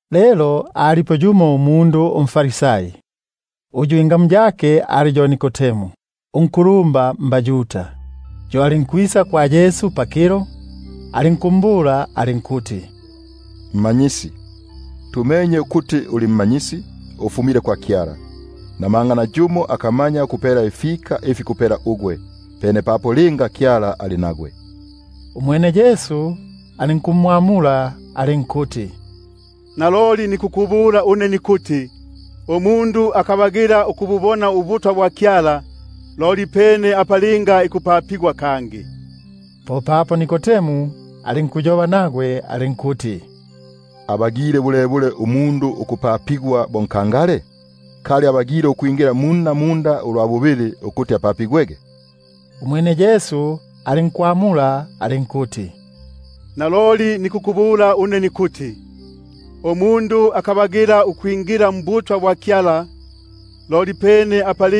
Lelo alipo yumo umundu umFarisai, ingamu yake ali yo Nikodemu, unkulumba mbaYuda. Yo alinkwisa kwa Yesu pakilo, alinkumbula alinkuti: Rabi,#Rabi ko kuti Mmanyisi. tumenye ukuti uli mmanyisi, ufumile kwa Kyala, namanga nayumo akamanya ukupela ifika ifi kupela ugwe, pene papo linga Kyala ali nagwe. Umwene Yesu alinkumwamula alinkuti: Naloliloli nikukubula une nikuti, umundu akabagila ukububona ubutwa bwa Kyala, loli pene apa linga ikupapigwa kangi. Popapo Nikodemu alinkuyoba nagwe alinkuti: Abagile bulebule umundu ukupapigwa bo nkangale? Kali abagile ukwingila munna munda ulwa bubili ukuti apapigwege? Umwene Yesu alinkwamula alinkuti: Naloliloli nikukubula une nikuti, umundu akabagila ukwingila mbutwa bwa Kyala, loli pene apa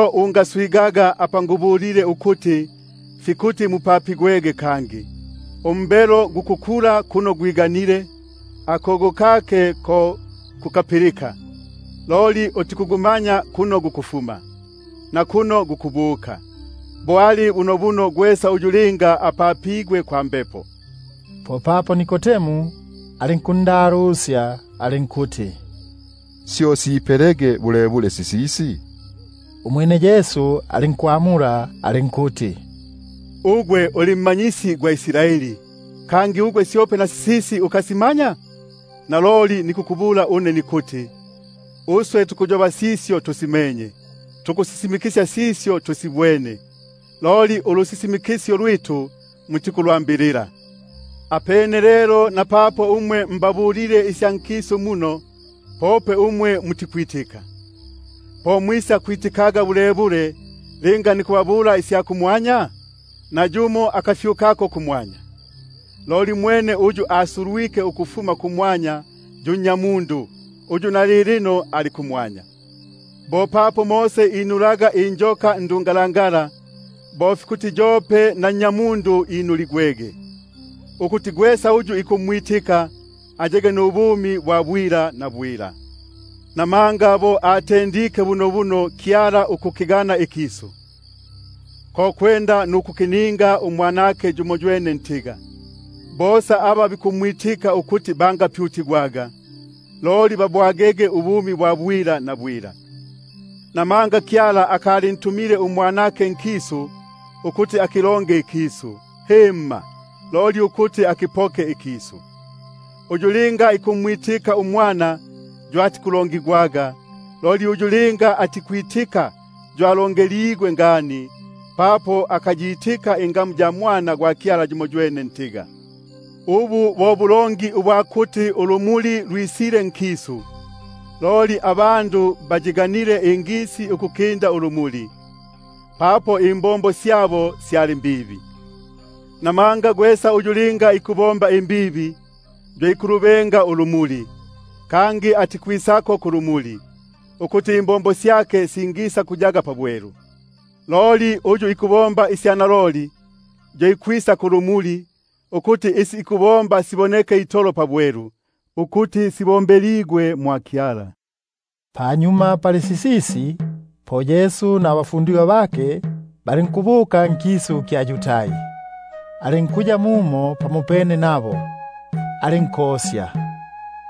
Ungaswigaga apa ngubulile ukuti, fikuti mupapigwege kangi. Umbelo gukukulila kuno gwiganile, akogo kake ko kukapilika, loli utikugumanya kuno gukufuma, nakuno gukubuka; bo ali bunobuno gwesa uyu linga apapigwe kwa Mbepo. Popapo Nikodemu alinkundalusya alinkuti: Syo sipelege bulebule sisisi? Umwene Yesu alinkumwamula alinkuti: Uli mma- nyisi gwa Israeli, syope na sisisi ukasimanya? Naloliloli nikukubula une nikuti, uswe tukuyoba sisyo tusimenye, nikusisimikisya sisyo tusibwene; loli ulusisimikisyo lwitu mutikulwambilila. Linga nikubabula umwe isya nkisu, loli mutikwitika, po mwisakwitika bulebule linga nikubabula isya kumwanya? Nayumo akafyukako kumwanya, loli mwene uyu asulwike ukufuma kumwanya, yo yu Nnyamundu, [uyu ali kumwanya.] Bo papo Mose inulaga injoka ndungalangala, bo fikuti yope na Nnyamundu inuligwege, ukuti gwesa uyu ikumwitika, ayege nubumi bwa bwila. Namanga bo akiganile bunobuno Kyala ikisu, ko kwenda nukukipa uMwanake yumoywene ntiga, bosa aba bikumwitika ukuti bangapyutigwaga, loli babwage ubumi bwa bwila. Namanga Kyala akalintumile uMwanake nkisu ukuti akilonge ikisu, loli ukuti ikisu kipokeligwege mmyake. Uyu linga ikumwitika yo atikulongigwaga; loli uyu linga atikwitika yo alongeligwe ngani, papo akayitika ingamu ya Mwana gwa Kyala yumoywene ntiga. Ubu bo bulongi ubwa kuti ulumuli lwisile nkisu, loli abandu bayiganile ingisi ukukinda ulumuli, papo imbombo syabo syali mbibi. Buno gwesa uyu linga ikubomba imbibi, yo ikulubenga ulumuli, kangi atikwisa kulumuli, ukuti imbombo syake singisakuyaga pabwelu. Loli uyu ikubomba isya naloli, yo ikwisa kulumuli, ukuti isi ikubomba sibonekege itolo pabwelu ukuti sibombeligwe mwa Kyala. Panyuma pali sisisi, po Yesu nabafundigwa bake balinkubuka nkisu kya Yudai; alinkuya mumo pamopene nabo, alinkosya.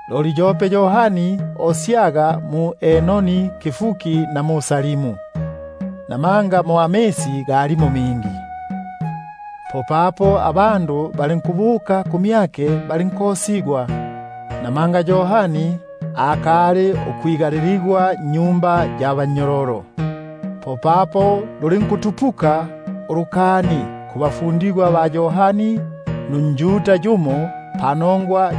Loli yope Yohani osyaga mu-Enoni pabupipi na Salimu, namanga mo amisi galimo mingi; popapo abandu balinkwisa balinkosigwa. Namanga Yohani akali ukwiga- liligwa nnyumba ya bannyololo. Popapo lulinkutupuka ulukani pakati pabafundigwa ba Yohani nunjuda yumo panongwa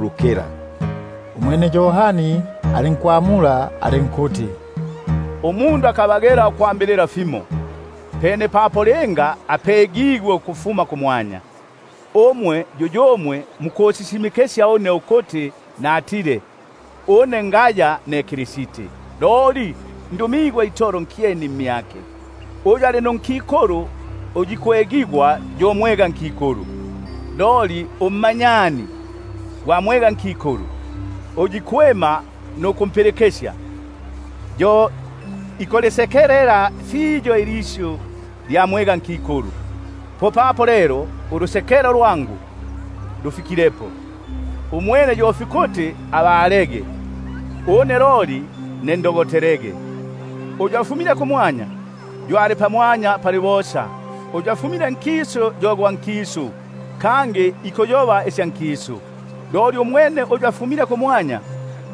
lukila. Umwene Yohani alinkwamula alinkuti: Umundu akabagila ukwambilila fimo, pene papo linga apegigwe ukufuma kumwanya. Yuyumwe mukusisimikisya une ukuti natile: Une ngaya ne Kristi, loli ndumigwe itolo nkyeni mmyake. Uyu ali nunkikulu uyu ikwegigwa yo mwegankikulu, loli ummanyani gwa mwegankikulu, uyu ikwima nukumpilikisya, yo ikulisekelela fiyo ilisyu lya mwegankikulu. Popapo lelo ulusekelo lwangu ulu lufikilepo. Umwene fikuti abalege, une loli ndogotelege. Uyu afumile kumwanya, yo ali pamwanya pali bosa; uyu afumile nkisu yo gwa nkisu, kangi ikuyoba isya nkisu. Umwene uyu afumile kumwanya,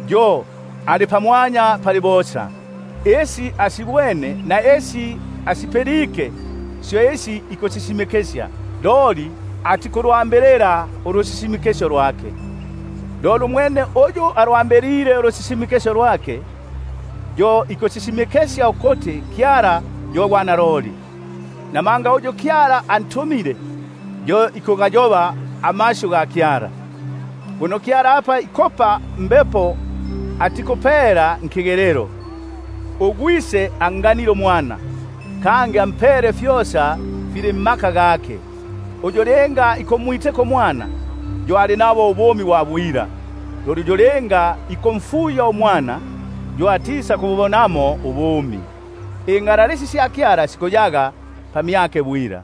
yo ali pamwanya pali bosa. Isi asibwene na isi asipilike syo ikusisisimikisya, loli nayumo atikulwambilila ulusisimikisyo lwake. Umwene uyu alwambilile ulusisimikisyo lwake, yo ikusisimikisya ukuti Kyala yo gwa naloli. Namanga uyu Kyala antumile, yo ikugayoba amasyu ga Kyala; buno Kyala apa ikupa Mbepo atikupela pakigelelo. UGwise anganile uMwana, kangi ampele fyosa nkiboko kyake. Uyu ikumwitika uMwana, yo ali nabo ubumi bwa bwila; loli uyu ikumfuya uMwana yo atisakububonaga ubumi, yo ingalalisi sya Kyala sikuyaga pamyake.